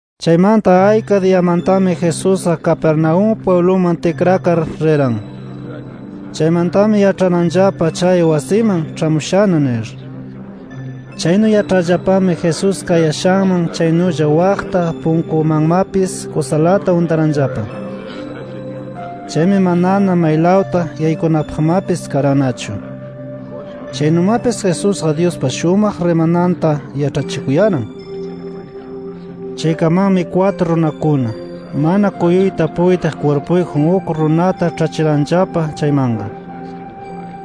Chaymanta, ayka diyamantami Jesusqa Capernaúm pwibluman tikrakar riran. Chaymantami yaĉharanllapa chay wasiman, ĉhamushana nir. Chaynu yaĉharllapami Jesús kayashanman chaynulla waqta punkumanmapis kusalata untaranllapa. Chaymi manana maylawta yaykunapaqmapis karannachu. Chaynumapis Jesusqa Dyuspa shumaq rimananta yaĉhachikuyaran. Chaykamanmi kwatru runakuna, mana kuyuyta puytiq kwirpuyjun uk runata ĉhachiranllapa chaymanqa.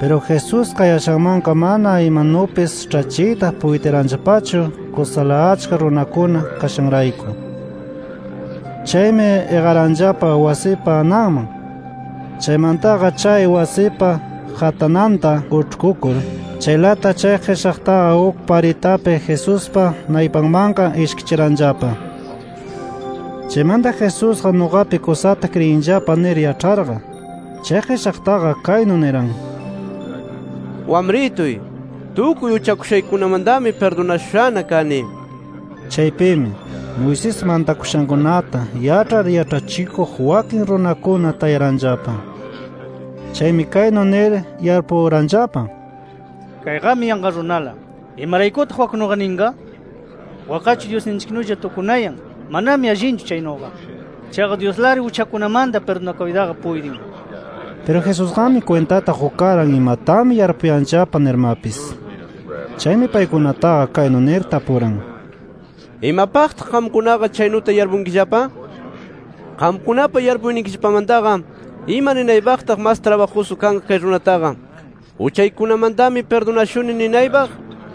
Piru Jesús kayashanmanqa mana imanupis ĉhachiyta puytiranllapachu kusala achka runakuna kashanrayku. Chaymi iqaranllapa wasipa ananman. Chaymantaqa chay wasipa qatananta uĉhkukur, chaylata chay qishaqtaqa uk paritapi Jesuspa naypanmanqa ishkichiranllapa. Chaymanta Jesusqa nuqapi kusata kriyinllapa nir yaĉharqa, chay qishaqtaqa kaynu niran: —Wamrituy, tukuy uchakushaykikunamantami pirdunashushana kani nir. Chaypimi, Moisés mantakushankunata yaĉhar yaĉhachikuq wakin runakuna tayaranllapa. Chaymi kaynu nir yarpuranllapa: Kayqami yanqa runala. ¿Imaraykutaq waknuqa ninqa? Wakqachu Dyusninchiknulla tukunayan. Manami allinchu chaynuqa. Chaqa Dyuslari uchakunamanta pirdunakuytaqa puytin nir. Piru Jesusqami kwintata qukaran imatami yarpuyanllapa nirmapis. Chaymi paykunataqa kaynu nir tapuran: —¿Imapaqtaq qamkunaqa chaynuta yarpunkillapa? ¿Qamkunapa yarpuynikillapamantaqa ima ninaypaqtaq mas trabajusu kanqa kay runataqa ‘Uchaykikunamantami pirdunashuni’ ninaypaq,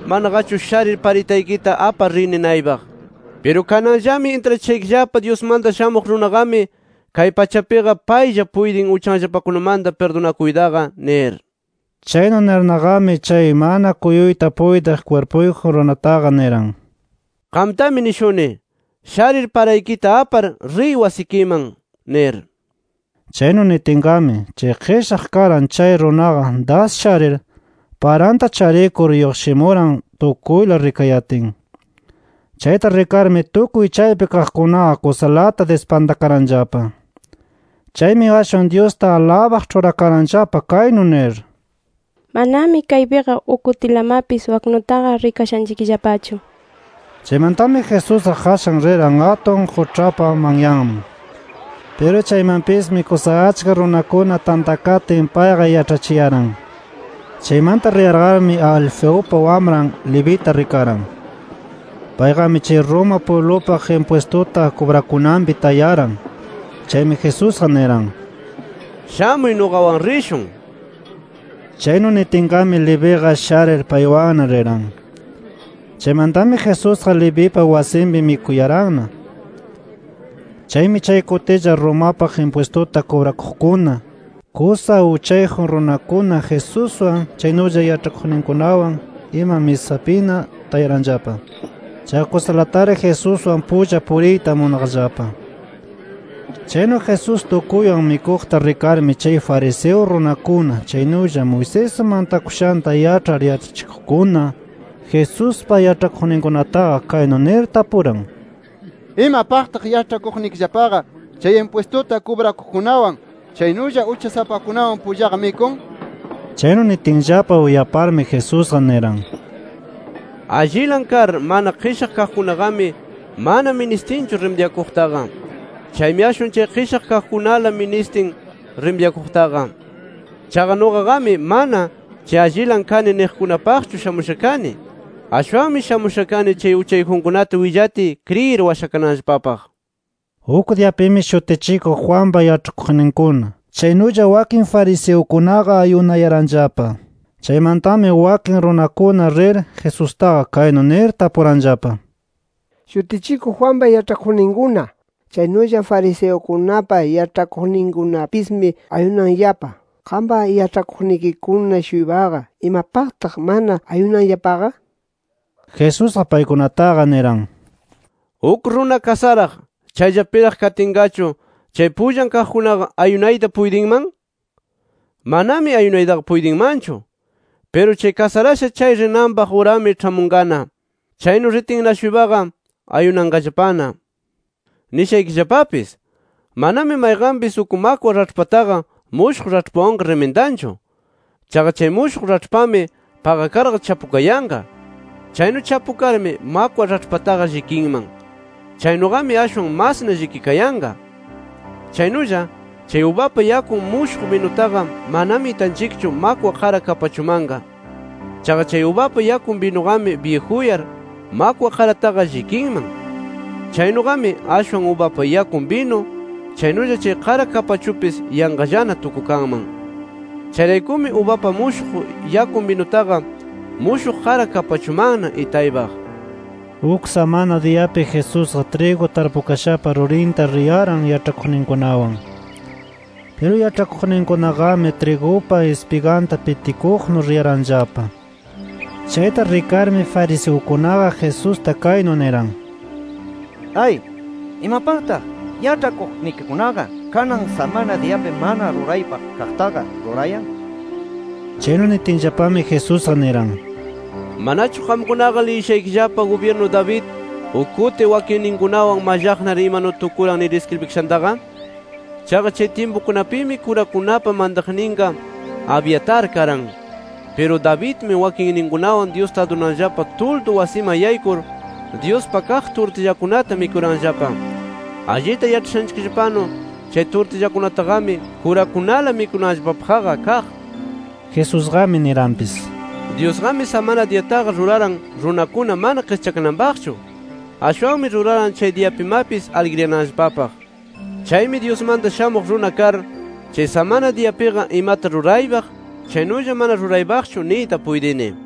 manaqachu ‘Sharir paraykita apar riy’ ninaypaq? Piru kananllami intrachishaykillapa Dyusmanta Shamuq Runaqami kay pachapiqa paylla puytin uchanllapakunamanta pirdunakuytaqa nir. Chaynu nirnaqami chay mana kuyuyta puytiq kwirpuyjun runataqa niran: —Qamtami nishuni: Sharir paraykita apar, riy wasikiman nir. Chaynu nitinqami, chay qishaq karan chay runaqa das sharir, paranta charikur lluqshimuran tukuyla rikayatin. Chayta rikarmi tukuy chaypi kaqkunaqa kusalata dispantakaranllapa. Chaymi ashwan Dyusta alabaq ĉhurakaranllapa kaynu nir: “¡Manami kaypiqa uk kutilamapis waknutaqa rikashanchikllapachu!” nir. Chaymantami Jesusqa qashan riran atun quĉhapa manyanman. Piru chaymanpismi kusa achka runakuna tantakatin payqa yaĉhachiyaran. Chaymanta riyarqami Alfeupa wamran Levita rikaran. Payqami chay Roma pwiblupaq impwistuta kubrakunanpi tayaran. Chaymi Jesusqa niran: —Shamuy nuqawan rishun nir. Chaynu nitinqami Leviqa sharir paywanna riran. Chaymantami Jesusqa Levipa wasinpi mikuyaranna. Chaymi chay kutilla Romapaq impwistuta kubrakuqkuna, kusa uchayjun runakuna Jesuswan chaynulla yaĉhakuqninkunawan ima misapina tayaranllapa. Chaqa kusalatari Jesuswan pulla puriyta munaqllapa. Chaynu Jesús tukuywan mikuqta rikarmi chay fariseo runakuna chaynulla Moisés mantakushanta yaĉhar yaĉhachikuqkuna, Jesuspa yaĉhakuqninkunataqa kaynu nir tapuran: —¿Imapaqtaq yaĉhachikuqnikillapaqa chay impwistuta kubrakuqkunawan chaynulla uchasapakunawan pullaqa mikun? nir. Chaynu nitinllapa uyaparmi Jesusqa niran: —Allilan kar mana qishaq kaqkunaqami mana ministinchu rimidyakuqtaqa. Chaymi ashwan chay qishaq kaqkunala ministin rimidyakuqtaqa. Chaqa nuqaqami mana, chay allinla kani niqkunapaqchu shamusha kani. Ashwanmi shamusha kani chay uchayjunkunata willatiy kriyir washakananllapapaq. Uk diyapimi Shutichikuq Juanpa yaĉhakuqninkuna, chaynulla wakin fariseukunaqa ayunayaranllapa. Chaymantami wakin runakuna rir, Jesustaqa kaynu nir tapuranllapa: —Shutichikuq Juanpa yaĉhakuqninkuna, chaynulla fariseukunapa yaĉhakuqninkunapismi ayunanllapa. Qampa yaĉhakuqnikikuna-shuypaqa, ¿imapaqtaq mana ayunanllapaqa? nir. Jesusqa paykunataqa niran: —Uk runa kasaraq, chayllapiraq katinqachu chay pullan kaqkunaqa ¿ayunayta puytinman? Manami ayunaytaqa puytinmanchu. Piru chay kasarasha rinanpaq urami ĉhamunqana. Chaynu ritinna-shuypaqa ayunanqallapana. “Nishaykillapapis: Manami mayqanpis uk makwa raĉhpataqa mushuq raĉhpawanqa rimindanchu. Chaqa chay mushuq raĉhpami paqakarqa chapukayanqa. Chaynu chapukarmi, makwa raĉhpataqa llikinman. Chaynuqami ashwan masna llikikayanqa. Chaynulla, chay ubapa yakun mushuq binutaqa manami itanchikchu makwa qara kapachumanqa. Chaqa chay ubapa yakun binuqami byijuyar makwa qarataqa llikinman. Chaynuqami ashwan ubapa yakun binu chaynulla chay qara kapachupis yanqallana tukukanman. Chayraykumi, ubapa mushuq yakun binutaqa mushuq qara kapachumanna itaypaq”. Uk samana diyapi Jesusqa trigu tarpukashapa rurinta riyaran yaĉhakuqninkunawan. Piru yaĉhakuqninkunaqami trigupa ispiganta pitikuqnu riyaranllapa. Chayta rikarmi fariseukunaqa Jesusta kaynu niran: —¡Ay! ¿Imapaqtaq yaĉhakuqnikikunaqa kanan samana diyapi mana ruraypaq kaqtaqa rurayan? nir. Chaynu nitinllapami Jesusqa niran: —¿Manachu qamkunaqa liyishaykillapa, gubyirnu David uk kuti wakinninkunawan mallaqnar imanu tukuran nir iskribikashantaqa? Chaqa chay tyimpukunapimi kurakunapa mantaqninqa Abiatar karan. Piru Davidmi wakinninkunawan Dyusta adurananllapa tuldu wasiman yaykur, Dyuspa kaq turtillakunata mikuranllapa. Allita yaĉhashanchikllapanu, chay turtillakunataqami, kurakunala mikunanllapapaqqa kaq. Jesusqami niranpis: —Dyusqami samana diyataqa ruraran runakuna mana qischakananpaqchu. Ashwanmi ruraran chay diyapimapis aligriyananllapapaq. Chaymi Dyusmanta Shamuq Runa kar, chay samana diyapiqa imata ruraypaq chaynulla mana ruraypaqchu niyta puytini.